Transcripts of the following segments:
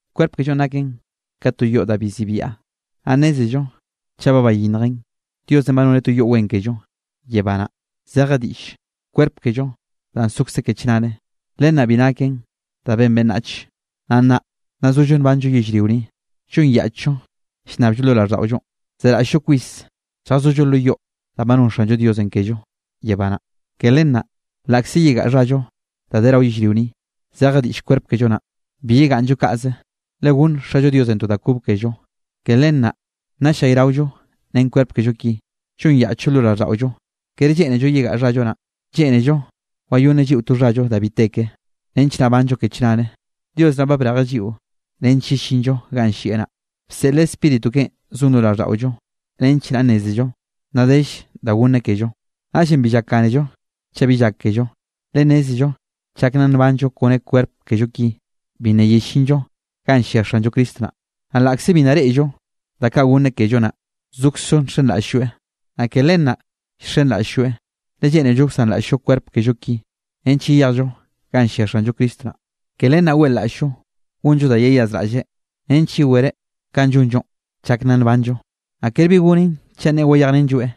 Kwerp kellonꞌ naken ka to yoꞌ da bi zibia. Naꞌ nnézello chaꞌ ba bayinnjen, Diosenꞌ ba noneꞌ to yoꞌ wen kello yebá naꞌ, zeje diꞌllenꞌ kwerp kello danꞌ sokze ke chnare. Len naꞌ bi naken da ben beꞌnnach. Naꞌ nnaꞌ nna zollo nbanllo yellrio ni, llonyaꞌchllo llnnabllo lo raꞌlldaꞌollo, zeraꞌll-llo kwis lljazollo lo yoꞌ danꞌ ba non Xanllo Diosenꞌ kello yebá naꞌ. Ke len naꞌ laꞌkze yegaꞌa xhallo da de rao yellrio ni, zeje diꞌll kwerp kello naꞌn, bi yegaꞌnnllo kaꞌze, le gonn Xallo Diosenꞌ to da kob kello. Ke len naꞌ nna ll-llayraollo ren kwerp kello ki, llonyaꞌchllo lo raꞌlldaꞌollo. Kere lleꞌnello yegaꞌa xhallo naꞌ, lleꞌnello wayonneꞌ lliꞌo to xhallo da bi te ke, nench naꞌ banllo ke chnare. Dios naꞌ ba brejeꞌ lliꞌo nench yellinllo ganꞌ llieꞌ naꞌ, bseꞌleꞌ Spíritu keꞌen zon lo raꞌlldaꞌollo, nench naꞌ nnézello nna dell da gonneꞌ kello. Naꞌllenꞌ bi llakgánello chaꞌ bi llákello, le nnézello chak nna nbanllo kone kwerp kello ki, bi nna yellinllo ganꞌ llia Xanllo Cristo naꞌ. Naꞌ laꞌkze bi nna reꞌllo da kaꞌ gonneꞌ kello naꞌ, zokzllo nxenraꞌll-lloeꞌ. Naꞌ ke len naꞌ llxenraꞌll-llo, le lleꞌnello wsanraꞌll-llo kwerp kello ki, nench yeyejllo ganꞌ llia Xanllo Cristo naꞌ. Ke len naꞌ weꞌlaꞌll-llo gonllo da yeyazraꞌlleꞌ nench yewereꞌ kanꞌ llonllo chak nna nbanllo, naꞌ ker bi gonen chaꞌ nneꞌe wayejrenlloeꞌ.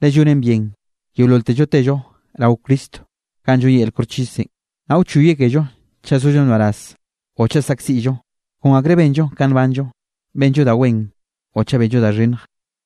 Le llonen bien yeololtello tello rao Cristonꞌ ganꞌ lloneꞌ yel koxchisenꞌ, naꞌ wchoyeꞌ kello chaꞌ sollo nbaraz o chaꞌ saꞌkziꞌllo, kon akrenꞌ benllo ka nbanllo, benllo da wen o chaꞌ benllo da xhinnj.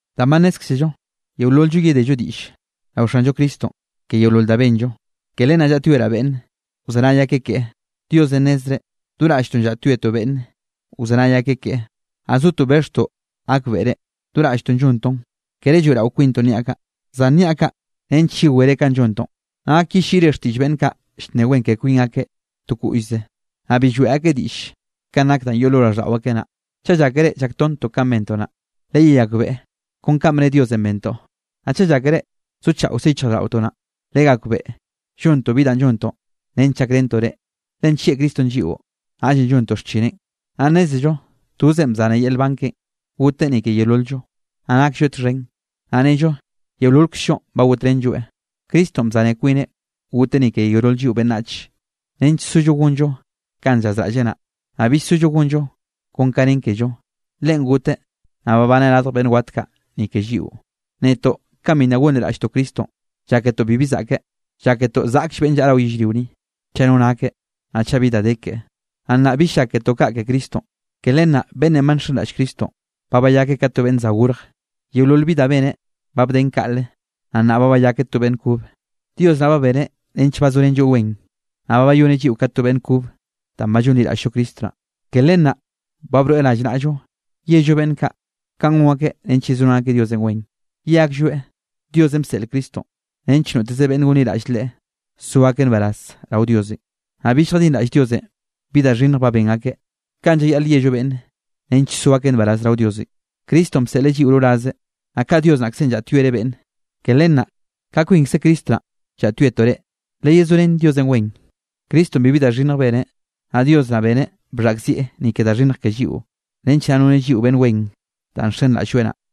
Danꞌ ba nnézkzello yeolol-llo yedello diꞌll rao Xanllo Cristonꞌ ke yeolol da benllo, ke len naꞌ llaꞌtyoeraꞌ beꞌnne wzenay akeꞌ keꞌe. Diosenꞌ nnezreꞌ, do raꞌlltoꞌ llaꞌtyoetoꞌ beꞌnne wzenay akeꞌ keꞌe, naꞌ zotoꞌ bexhtoꞌ gakbeꞌre, do raꞌlltoꞌ llontoꞌn. Kere lloeꞌrao kwintoꞌ niaꞌ kaꞌ, zan niaꞌ kaꞌ nench yewere kanꞌ llontoꞌ, naꞌ gak yelliꞌre xtiꞌll beꞌnn kaꞌ llnne wen ke kwin akeꞌ to koꞌllze, naꞌ bi lloeꞌ akeꞌ diꞌll kanꞌ nak danꞌ yoꞌ lo raꞌlldaꞌo akeꞌ naꞌ. Chaꞌ llákere llaktonttoꞌ kanꞌ bentoꞌ naꞌ, leyeyakbeꞌe kon kanꞌ bne Diosenꞌ bentoꞌ. Naꞌ chaꞌ llákere zochaꞌokze yichjraꞌlldaꞌotoꞌ naꞌn, legakbeꞌe llontoꞌ bi da llontoꞌ nench llakrentoꞌ reꞌ. Le nllieꞌ Cristonꞌ lliꞌo, naꞌllenꞌ llontoꞌ xchineꞌn. Naꞌ nnézello tozeꞌn bzaneꞌ yel nban keꞌen goteꞌ ni ke yeolol-llo, naꞌ naklloeꞌ txhen, naꞌ nnello yeololkzllonꞌ ba gotrenlloeꞌ. Cristonꞌ bzane kwineꞌ goteꞌ ni ke yeolol lliꞌo beꞌnnach, nench sollo gonllo kanꞌ llazraꞌlleꞌ naꞌ, naꞌ bill sollo gonllo kon ka nen kello. Leꞌen goteꞌ naꞌ babaneꞌ radj beꞌnn wat kaꞌ ni ke lliꞌo. Netoꞌ kanꞌ bi nna gonliraꞌlltoꞌ Cristonꞌ, lláketoꞌ bibi zaꞌkeꞌ, lláketoꞌ zaꞌkll beꞌnne llaꞌa rao yellrio ni, chaꞌ no nakeꞌ, naꞌ chaꞌ bi da de keꞌe. Naꞌ nnaꞌ bill lláketoꞌ kaꞌ ke Cristonꞌ. Ke len naꞌ beꞌnnenꞌ ba nxenraꞌll Cristonꞌ, ba bayakeꞌ ka to beꞌnn za gorj. Yeolol bi da beneꞌ, ba bden kaꞌle, naꞌ nnaꞌ ba bayakeꞌ to beꞌnn kobe. Dios naꞌ ba beneꞌ nench bazorenlloeꞌ wen, naꞌ ba bayoneꞌ lliꞌo ka to beꞌnn kobe danꞌ ba llonliraꞌll-llo Cristo naꞌ. Ke len naꞌ ba broeꞌ rallnaꞌllo yello beꞌnn kaꞌ ka gon akeꞌ nench yezorén akeꞌ Diosenꞌ wen. Ye aklloeꞌ Diosenꞌ bseꞌleꞌ Cristonꞌ nench noteze beꞌnne gonliraꞌll Leꞌe, so akeꞌ nbaraz rao Diosenꞌ, naꞌ bill lljadinraꞌll Diosenꞌ bi da xhinnj ba ben akeꞌ. Kaꞌn llayaꞌl yello beꞌnne nench so akeꞌ nbaraz rao Diosenꞌ. Cristonꞌ bseꞌleꞌ lliꞌo rorazeꞌ, naꞌ ka Dios naꞌkzenꞌ llaꞌtyoereꞌ beꞌnne, ke len naꞌ ka kwinkze Cristo naꞌ llaꞌtyoetoꞌ reꞌ: leyezorén Diosenꞌ wen. Cristonꞌ bibi da xhinnj beneꞌ. Naꞌ Dios naꞌ beneꞌ bxhaꞌkzieꞌ ni ke da xhinnj ke lliꞌo, nench naꞌ noneꞌ lliꞌo beꞌnn wen danꞌ nxenraꞌll-lloeꞌ naꞌ.